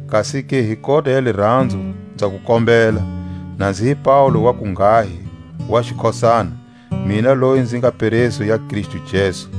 kasi-ke hi kota ya liranzo nza ku kombela, na nzi hi Paule wa kunghahi wa xikhosana, mina loyi nzi nga peresu ya Kristu Jesu.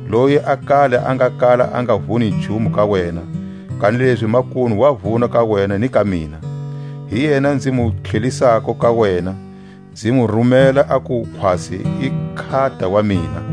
loyi a kale a nga kala a nga vuni nchumu ka wena, kanilezi makunu wa vuna ka wena ni ka mina. Hi yena nzi mu tlhelisako ka wena; nzi mu rumela aku khwatsi i nkhata wa mina,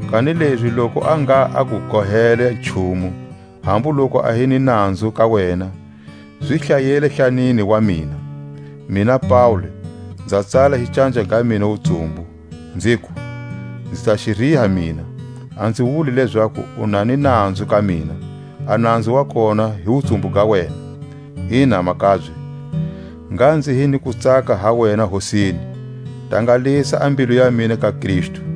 Kanilezi loku a ngha a ku gohele nchumu, hambu loku a hi ni nanzu ka wena, zi hlayele hlanini wa mina. Mina Paule, nza tsala hi canja ga mina wutsumbu, nziku; Nzi ta xi riha mina. A nzi wuli lezaku u na ni nanzu ka mina, a nanzu wa kona hi wutsumbu ga wena. Ina, makabye, ngha nzi hi ni kutsaka ha wena Hosini; tangalisa a mbilu ya mina ka Kristu.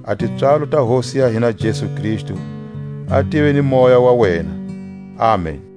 A tipswalo ta Hosi ya hina Jesu Kristu a tive ni moya wa wena. Amen!